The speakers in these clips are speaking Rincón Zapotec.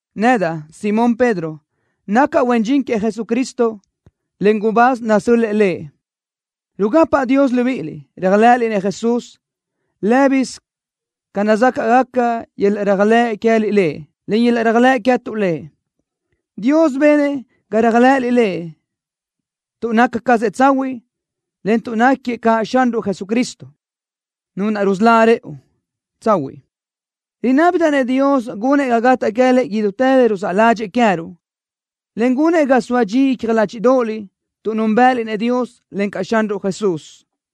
Nedaʼ, Simón Pedro, nacaʼ huen dxin queëʼ Jesucristo, en gubáz nasö́l-lëʼë Lëʼ. Rugapaʼ Dios libíʼiliʼ, réajlëʼëliʼ-nëʼ Jesús. Lë́bisö ca nazácaʼgaca yöl-laʼ réajlëʼ queë́liʼ Lëʼ, en yöl-laʼ réajlëʼ queë́tuʼ Lëʼ. Dios benëʼ ga réajlëʼëliʼ Lëʼ tuʼ naca cazëʼ tsahuiʼ, en tuʼ náquiëʼ caʼ Xanruʼ Jesucristo, Nu naʼ rusölá rëʼu, tsahuiʼ. Rinábidaʼ-nëʼ Dios gunëʼ ga gataʼ queë́liʼ idútë le ruzáʼ ládxëʼë queë́ruʼ, en gunëʼ ga soa dxi icja ládxiʼdoʼoliʼ tuʼ núnbëʼëliʼ-nëʼ Dios, encaʼ Xanruʼ Jesús.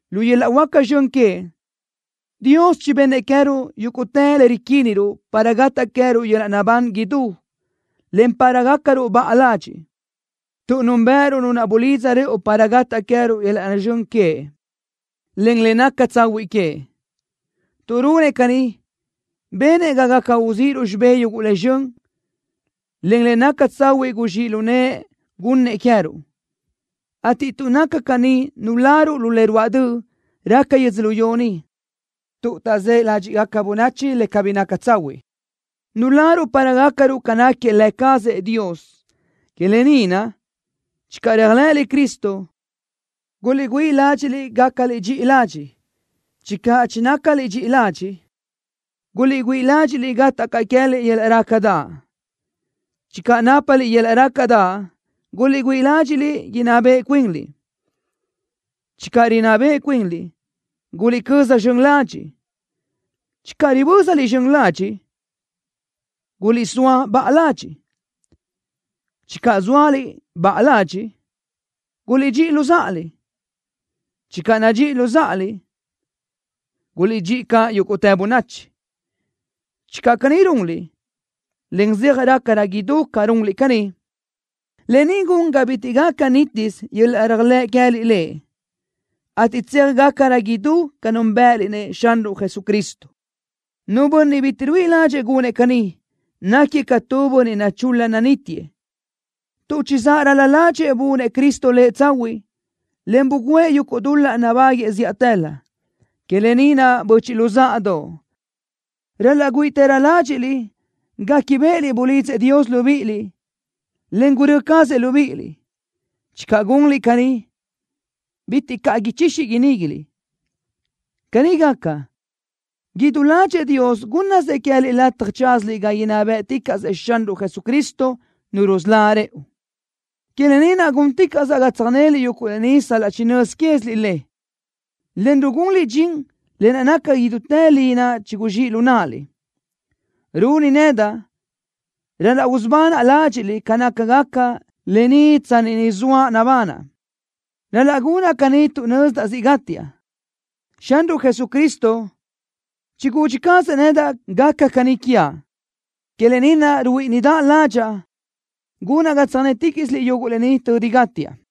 Lu yöl-laʼ huáca zxön queëʼ, Dios chibennëʼ queë́ruʼ yúguʼtë le riquíniruʼ para gataʼ queë́ruʼ yöl-laʼ naʼbán idú, en para gácaruʼ baʼa ladxiʼ, tuʼ núnbëʼëruʼ Nu naʼ bulidza rëʼu para gataʼ queë́ruʼ yöl-laʼ zxön queëʼ, en le naca tsahuiʼ queëʼ. Tuʼ runëʼ caní, benëʼ ga gaca uzíʼiruʼ xibé yuguʼ le zxön, en le naca tsahuiʼ guzxíʼ lu nëʼë gunnëʼ queë́ruʼ, ateʼ tuʼ naca caní nuláruʼ lu le ruáʼ döʼ raca yödzölió ni tuʼ taʼzë́ ládxiʼgaca bönachi le cabí naca tsahuiʼ. Nuláruʼ para gácaruʼ ca náquiëʼ Lë cazëʼ Dios. Que lë ni naʼ: Channö réajlëʼëliʼ Cristo, guliʼgüíʼ ládxiʼliʼ gácaliʼ dxiʼi ladxiʼ. Channö chinácaliʼ dxiʼi ladxiʼ, guliʼgüíʼ ládxiʼliʼ gataʼ caʼ queë́liʼ yöl-laʼ rácadaʼ. Channö nápaliʼ yöl-laʼ rácadaʼ, guliʼgüíʼ ládxiʼliʼ inná beʼe cuinliʼ. Channö rinná beʼe cuinliʼ, guliʼcöza zxön ladxiʼ. Channö ribö́zaliʼ zxön ladxiʼ, guliʼsóa baʼa ladxiʼ. Channö zóaliʼ baʼa ladxiʼ, guliʼdxíʼi luzáʼaliʼ. Channö nadxíʼiliʼ luzáʼaliʼ, guliʼdxíʼi caʼ yúguʼtë bönachi. Channö caní runliʼ, en zeaj rácarö idú ca runliʼ caní, lë ni gun ga bitiʼ gaca nítisö yöl-laʼ réajlëʼ queë́liʼ Lëʼ, ateʼ tseaj gácarö idú ca núnbëʼëliʼ-nëʼ Xanruʼ Jesucristo. Nu bönniʼ bitiʼ ruíʼi ládxëʼë gunëʼ caní, náquiëʼ ca tu bönniʼ nachul-la nanítiëʼ, tuʼ chizáʼ ral-la ládxëʼë bunëʼ Cristo lëʼ tsahuiʼ, en bugǘëʼ yuguʼ dul-laʼ gubáguëʼë zíʼatëlö. Que lë ni naʼ, böchiʼ luzáʼadoʼ, ral-laʼ güíʼitërö ládxiʼliʼ guéquibeʼeliʼ bulidzëʼ Dios libíʼiliʼ, en gurö́ cazëʼ libíʼiliʼ. Channö gunliʼ caní, bitiʼ caʼ ichixi iníguiliʼ. Caní gaca, idú ládxëʼë Dios gúnnasëʼ queë́liʼ lataj tsázaliʼ ga inná bë́ʼticaʼsëʼ Xanruʼ Jesucristo, Nu rusölá rëʼu. Que lë ni naʼ gúnticaʼsaʼ ga tsöjnéliʼ yuguʼ lë ni sal-laʼ chinö́z quéziliʼ le, en rugunliʼ dxin le naca idútë li naʼ chiguzxíʼ lu náʼaliʼ. Runi nedaʼ ral-laʼ usubanaʼ ládxiʼliʼ ca nácagaca lë ni tsanni ni zoaʼ nabanaʼ. Ral-laʼ gunaʼ caní tuʼ nözdaʼ siʼ gátiaʼ. Xanruʼ Jesucristo chigudxi cazëʼ nedaʼ gaca caní quiaʼ. Que lë ni naʼ ruíʼidaʼ ládxaʼa gunaʼ ga tsöjnéticaʼsiliʼ yuguʼ lë ni tödi gátiaʼ.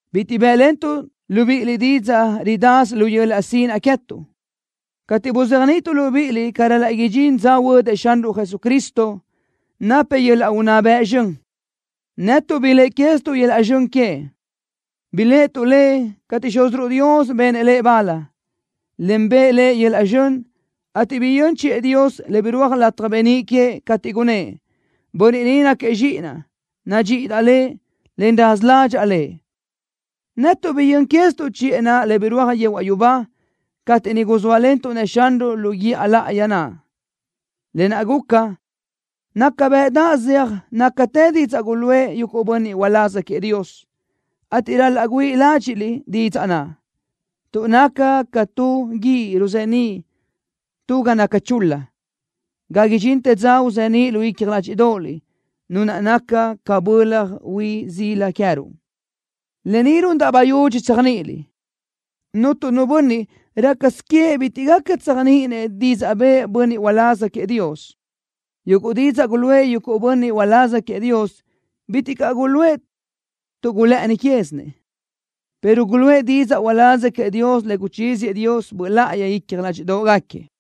Bitiʼ bë́ʼlentuʼ libíʼiliʼ tu didzaʼ ridasö lu yöl-laʼ sinaʼ queë́tuʼ, cateʼ buzéajniʼituʼ libíʼiliʼ ca ral-laʼ idxín dza huödëʼ Xanruʼ Jesucristo, napëʼ yöl-laʼ unná bëʼ zxön. Netuʼ biléʼe quézituʼ yöl-laʼ zxön queëʼ. Biléʼetuʼ Lëʼ cateʼ Xúziruʼ Dios benëʼ Lëʼ bal, en bëʼë Lëʼ yöl-laʼ zxön, ateʼ biyö́n chiʼë Dios, le birúaj lataj beníʼ queëʼ, cateʼ gunnë́ʼ: “Bönniʼ ni náquiëʼ Zxíʼinaʼ. Nadxíʼidaʼ Lëʼ, en raza ládxaʼa Lëʼ.” Netuʼ biyö́n quézituʼ chiʼë naʼ le birúaj yehuaʼ yubá cateʼ niʼ guzóalentuʼ-nëʼ Xanruʼ lu guíʼa láʼayi naʼ. Lë naʼ guca, naca bëʼdaʼ zeaj nácatë didzaʼ guluʼë yuguʼ bönniʼ uláz queëʼ Dios, ateʼ ral-laʼ güíʼi ládxiʼliʼ didzaʼ naʼ, tuʼ naca ca tu guíʼ ruzeníʼ tu ga naca chul-la ga idxintë dza uzeníʼ lu icja ládxiʼdoʼoliʼ Nu naʼ naca ca bölaj hui sila queë́ruʼ. Lë ni rundaʼ bayudxi tséajniʼiliʼ: Cuntu nu bönniʼ, rácasö queëʼ bitiʼ gaca tséajniʼinëʼ didzaʼ bëʼë tu bönniʼ uláz queëʼ Dios. Yuguʼ didzaʼ guluʼë yuguʼ bönniʼ uláz queëʼ Dios bitiʼ caʼ guluʼë tuʼ gulë́ʼëni quézinëʼ, pero guluʼë didzaʼ uláz queëʼ Dios le guchíziëʼ Dios Böʼ Láʼayi icja ládxiʼdoʼgaquiëʼ.